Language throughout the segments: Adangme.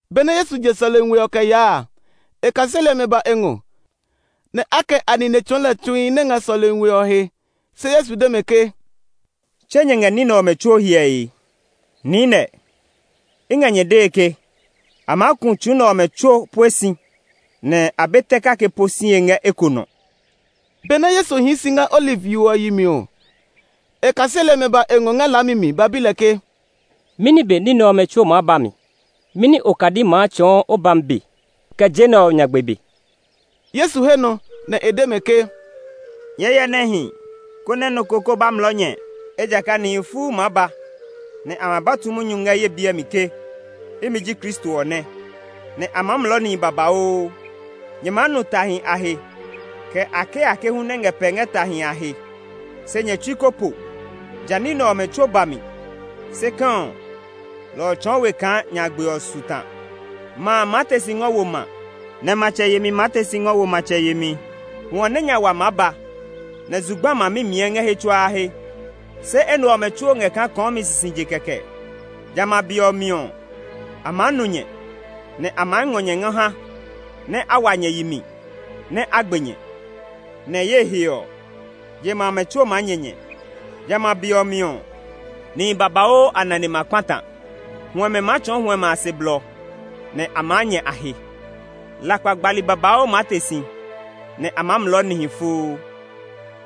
Benɛ Yesu je sɔlemi we ɔ mi kɛ yaa a, e kaseli ɔmɛ ba e ngɔ, nɛ a kɛ a nine tsɔɔ lɛ tsuhi nɛ ngɛ sɔlemi we ɔ he. Se Yesu de mɛ ke, “Tse nyɛ ngɛ ní nɛ ɔmɛ tsuo hyɛe? Niinɛ, i ngɛ nyɛ dee ke, a maa ku tsu nɛ ɔmɛ tsuo pue si nɛ a be tɛ kake po sie ngɛ eko nɔ.” Benɛ Yesu hii si ngɛ Oliv yo ɔ yi mi ɔ, e kaseli ɔmɛ ba e ngɔ ngɛ laami mi ba bi lɛ ke, “Mɛni be ní nɛ ɔmɛ tsuo maa ba mi? Mɛni okadi maa tsɔɔ o bami be, kɛ je nɛ ɔ nyagbe be?” Yesu he nɔ nɛ e de mɛ ke, “Nyɛɛ hyɛ nɛ hi, konɛ nɔ ko kó ba mlɔɔ nyɛ. Ejakaa nihi fuu maa ba, nɛ a ma ba tu munyu ngɛ ye biɛ mi ke, ‘Imi ji Kristo ɔ nɛ!’ nɛ a maa mlɔɔ nihi babauu. Nyɛ maa nu tahi a he, kɛ akeake hu nɛ ngɛ pɛe ngɛ tahi a he. Se nyɛ tsui ko po. Ja ní nɛ ɔmɛ tsuo ba mi; se kɛ̃, lɔ ɔ tsɔɔ we kaa nyagbe ɔ su ta. Ma maa te si ngɔ wo ma, nɛ matsɛ yemi maa te si ngɔ wo matsɛ yemi. Hwɔ nɛ nya wa maa ba, nɛ zugba ma mimiɛ ngɛ he tsuaa he. Se enɛ ɔmɛ tsuo ngɛ kaa kɔɔmi sisije kɛkɛ. “Jamɛ a be ɔ mi ɔ, a maa nuu nyɛ; nɛ a maa ngɔ nyɛ ngɔ ha nɛ a wa nyɛ yi mi nɛ a gbe nyɛ. Nɛ ye he ɔ, je ma amɛ tsuo maa nyɛ nyɛ. Jamɛ a be ɔ mi ɔ, nihi babauu a nane ma kpata; huɛmɛ maa tsɔɔ huɛmɛ a se blɔ, nɛ a maa nyɛ a he. Lakpa gbali babauu maa te si, nɛ a maa mlɔɔ nihi fuu.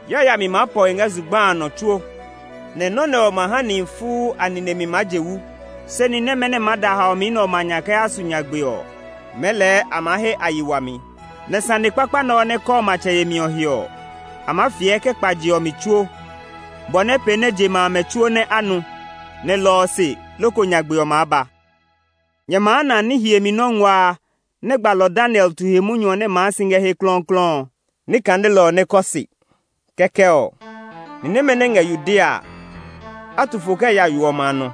Yayami maa pɔ he ngɛ zugba a nɔ tsuo, nɛ nɔ́ nɛ ɔ ma ha nihi fuu a nine mi maa je wu. Se ni nɛmɛ nɛ maa da haomi nɛ ɔmɛ a nya kɛ yaa su nyagbe ɔ, mɛɛ lɛɛ a ma he a yi wami. Nɛ sane kpakpa nɛ ɔ nɛ kɔɔ matsɛ yemi ɔ he ɔ, a maa fiɛ kɛ kpa je ɔ mi tsuo, bɔ nɛ pee nɛ je ma amɛ tsuo nɛ a nu; nɛ lɔ ɔ se loko nyagbe ɔ maa ba. “Nyɛ maa na ‘Ni hiemi nɔ́ ngua a’ nɛ gbalɔ Daniel tu he munyu ɔ nɛ maa si ngɛ he klɔuklɔu ɔ. (Ni kanelɔ ɔ nɛ kɔ se!) Kɛkɛ ɔ, ni nɛmɛ nɛ ngɛ Yudea a, a tu fo kɛ ya yo ɔmɛ a nɔ.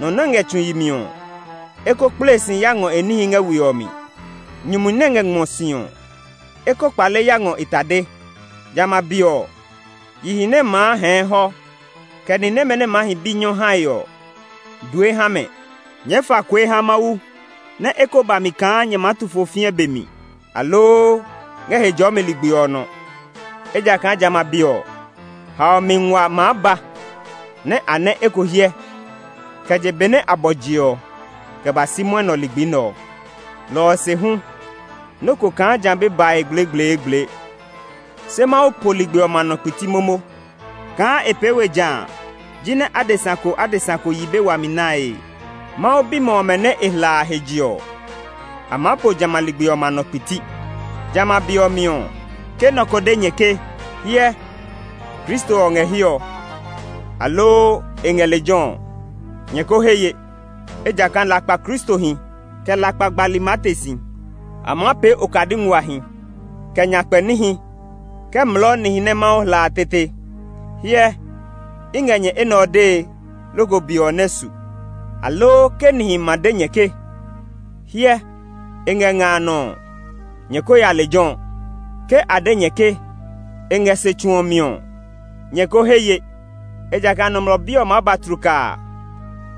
Nɔ nɛ ngɛ tsu yi mi ɔ, e ko kple si ya ngɔ e níhi ngɛ we ɔ mi. Nyumu nɛ ngɛ ngmɔ si ɔ, e ko kpale ya ngɔ e tade. Jamɛ a be ɔ, yihi nɛ maa hɛɛ hɔ, kɛ ni nɛmɛ nɛ maa hi bi nyɔ hae ɔ, due ha mɛ! Nyɛɛ fa kue ha Mawu nɛ e ko ba mi kaa nyɛ maa tu fo fĩɛ be mi, aloo ngɛ Hejɔɔmi ligbi nɔ! Ejakaa jamɛ a be ɔ, haomi nguaa maa ba nɛ a nɛ eko hyɛ kɛ je be nɛ a bɔ je ɔ kɛ ba si mwɔnɛ ligbi nɛ ɔ. Lɔ ɔ se hu, nɔ́ ko kaa ja be bae gblegbleegble. Se Mawu po ligbi ɔmɛ a nɔ kpiti momo; kaa e pee we jã jinɛ adesa ko adesa ko yi be wami nae. Mawu bimɛ ɔmɛ nɛ e hla a a he je ɔ, a maa po jamɛ a ligbi ɔmɛ a nɔ kpiti. “Jamɛ a be ɔ mi ɔ, ke nɔ ko de nyɛ ke, ‘Hyɛ, Kristo ɔ ngɛ hiɛ ɔ’, aloo, ‘E ngɛ lejɛ’ ɔ, nyɛ ko he ye. Ejakaa lakpa kristohi, kɛ lakpa gbali maa te si. A maa pee okadi nguahi, kɛ nyakpɛ níhi kɛ mlɔɔ nihi nɛ Mawu hla a tete. Hyɛ, i ngɛ nyɛ enɛ ɔ dee loko be ɔ nɛ su. “Aloo ke nihi ma de nyɛ ke, ‘Hyɛ, e ngɛ nga a nɔ’ ɔ, nyɛ ko ya lejɛ ɔ; ke a de nyɛ ke, ‘E ngɛ se tsu ɔ mi’ ɔ, nyɛ ko he ye. Ejakaa Nɔmlɔ Bi ɔ maa ba tlukaa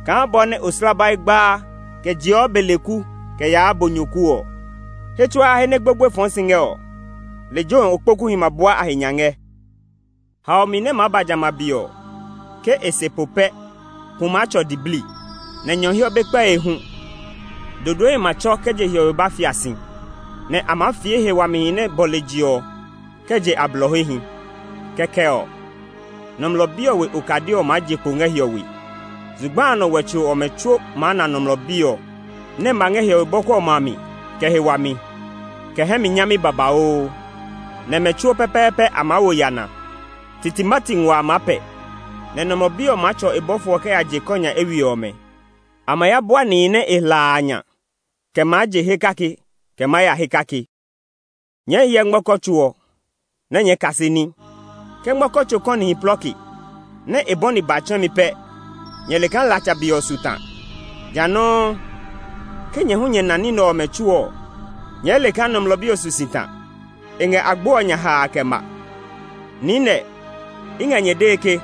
kaa bɔ nɛ oslabai gbaa kɛ jeɔ beleku kɛ yaa bonyoku ɔ. “He tsuaa he nɛ gbogboe fɔɔ si ngɛ ɔ, lejɛ ɔ okpokuhi ma bua a he nya ngɛ. “Haomi nɛ maa ba jamɛ a be ɔ, ke e se po pɛ pu maa tsɔ diblii, nɛ nyɔhiɔ be kpɛe hu. Dodoehi ma tsɔ kɛ je hiɔwe ba fia si, nɛ a maa fie he wamihi nɛ bɔle je ɔ kɛ je a blɔ hehi. Kɛkɛ ɔ, Nɔmlɔ Bi ɔ we okadi ɔ maa je kpo ngɛ hiɔwe. Zugba a nɔ wɛtso ɔmɛ tsuo maa na Nɔmlɔ Bi ɔ nɛ ma ngɛ hiɔwe bɔku ɔmɛ a mi kɛ he wami, kɛ hɛ mi nyami babauu. Nɛ mɛ tsuo pɛpɛɛpɛ a maa wo yana. Titimati nguaa a maa pɛ, nɛ Nɔmlɔ Bi ɔ maa tsɔ e bɔfo ɔmɛ kɛ ya je ɔ kɔ nya eywiɛ ɔmɛ. A ma ya bua nihi nɛ e hla a a nya kɛ maa je he kake kɛ maa ya he kake. “Nyɛɛ hyɛ ngmɔkɔ tso ɔ, nɛ nyɛɛ kase ní. Ke ngmɔkɔ tso kɔnihi plɔke, nɛ a bɔni ba tsɛ̃mi pɛ nyɛ le kaa latsa be ɔ su ta. Jã nɔuu, ke nyɛ hu nyɛ na ní nɛ ɔmɛ tsuo ɔ, nyɛɛ le kaa Nɔmlɔ Bi ɔ su si ta; e ngɛ agbo ɔ nya haa kɛ ma. Niinɛ, i ngɛ nyɛ dee ke,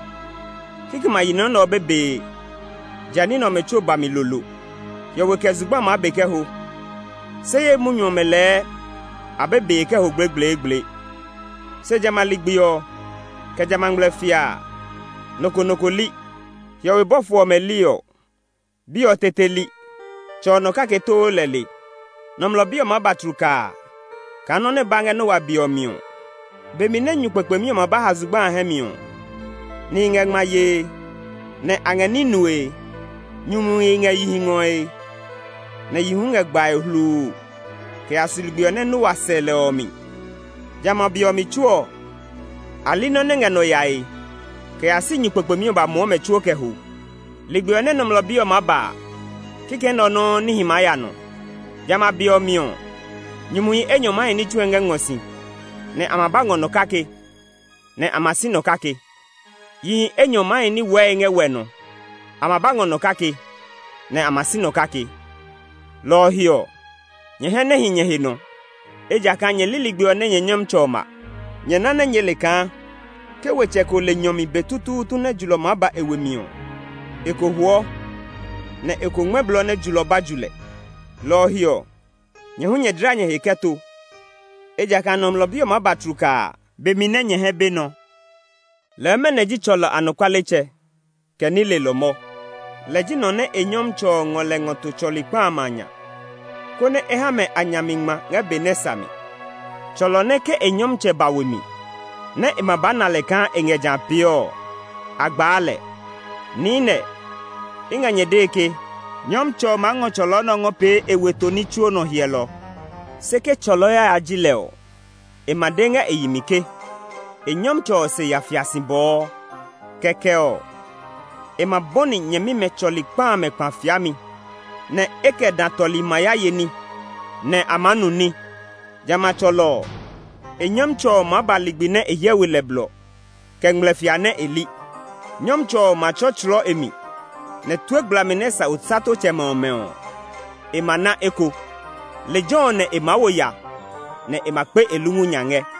kikɛmɛ a yi nɔ nɛ ɔ be bee, ja ní nɛ ɔmɛ tsuo ba mi lolo. Hiɔwe kɛ zugba maa be kɛ ho, se ye munyu ɔmɛ lɛɛ a be bee kɛ ho gblegbleegble. “Se jamɛ a ligbi ɔ, kɛ jamɛ a ngmlɛfia a, nɔ ko nɔ ko li. Hiɔwe bɔfo ɔmɛ li ɔ, Bi ɔ tete li; Tsɛ ɔ nɔ kake too lɛ le. Nɔmlɔ Bi ɔ maa ba tlukaa kaa nɔ́ nɛ ba ngɛ Noa be ɔ mi ɔ. Be mi nɛ nyu kpekpemi ɔ ma ba ha zugba a hɛ mi ɔ, nihi ngɛ ngma yee, nɛ a ngɛ ní nue; nyumuhi ngɛ yihi ngɔe, nɛ yihi hu ngɛ gbae hluu kɛ ya su ligbi ɔ nɛ Noa ya sɛ lɛ ɔ mi. Jamɛ a be ɔ mi tsuo ɔ, a li nɔ́ nɛ ngɛ nɔ yae kɛ ya si nyu kpekpemi ɔ ba muɔ mɛ tsuo kɛ ho. Ligbi ɔ nɛ Nɔmlɔ Bi ɔ maa ba a, kikɛ nɛ ɔ nɔuu níhi maa ya nɔ. Jamɛ a be ɔ mi ɔ, nyumuhi enyɔ maa hi ní tsue ngɛ ngmɔ si, nɛ a ma ba ngɔ nɔ kake, nɛ a ma si nɔ kake. Yihi enyɔ maa hi wɛɛe ngɛ wɛ nɔ; a ma ba ngɔ nɔ kake, nɛ a ma si nɔ kake. “Lɔ ɔ he ɔ, nyɛ hɛ nɛ hi nyɛ he nɔ; ejakaa nyɛ li ligbi ɔ nɛ nyɛ Nyɔmtsɛ ɔ ma. Nyɛ ná nyɛɛ le kaa ke wetsɛ ko le nyɔ mi be tutuutu nɛ julɔ maa ba e we mi ɔ, e ko huɔ, nɛ e ko ngmɛ́ blɔ nɛ julɔ ɔ ba ju lɛ. Lɔ ɔ he ɔ, nyɛ hu nyɛ dla nyɛ he kɛ to; ejakaa Nɔmlɔ Bi ɔ maa ba tlukaa be mi nɛ nyɛ hɛ be nɔ. “Lɛɛ mɛnɔ ji tsɔlɔ anɔkualetsɛ, kɛ ní lelɔ mɔ? Lɛ ji nɔ nɛ e nyɔmtsɛ ɔ ngɔ lɛ ngɔ to tsɔli kpa amɛ a nya, konɛ e ha mɛ a nya mi ngma ngɛ be nɛ sa mi. Tsɔlɔ nɛ ke e nyɔmtsɛ ɔ ba we mi, nɛ e ma ba na kaa e ngɛ jã pee ɔ, a gbaa lɛ. Niinɛ, i ngɛ nyɛ dee ke, nyɔmtsɛ ɔ maa ngɔ tsɔlɔ nɛ ɔ ngɔ pee e weto ní tsuo nɔ hyɛlɔ. Se ke tsɔlɔ yaya ji lɛ ɔ, e ma de ngɛ e yi mi ke e nyɔmtsɛ ɔ se ya fia si bɔɔ. Kɛkɛ ɔ, e ma bɔni nyɛmimɛ tsɔli kpa amɛ kpa fiami, nɛ e kɛ dã tɔli ma ya ye ní, nɛ a maa nu ní. Jamɛ a tsɔlɔ ɔ, e nyɔmtsɛ ɔ maa ba ligbi nɛ e hyɛ we lɛ blɔ, kɛ ngmlɛfia nɛ e li. Nyɔmtsɛ ɔ ma tsɔtslɔɔ e mi, nɛ tue gblami nɛ sa osatotsɛmɛ ɔmɛ ɔ, e ma na eko. Lejɛ ɔ nɛ e maa wo ya, nɛ e ma kpe e lungu nya ngɛ.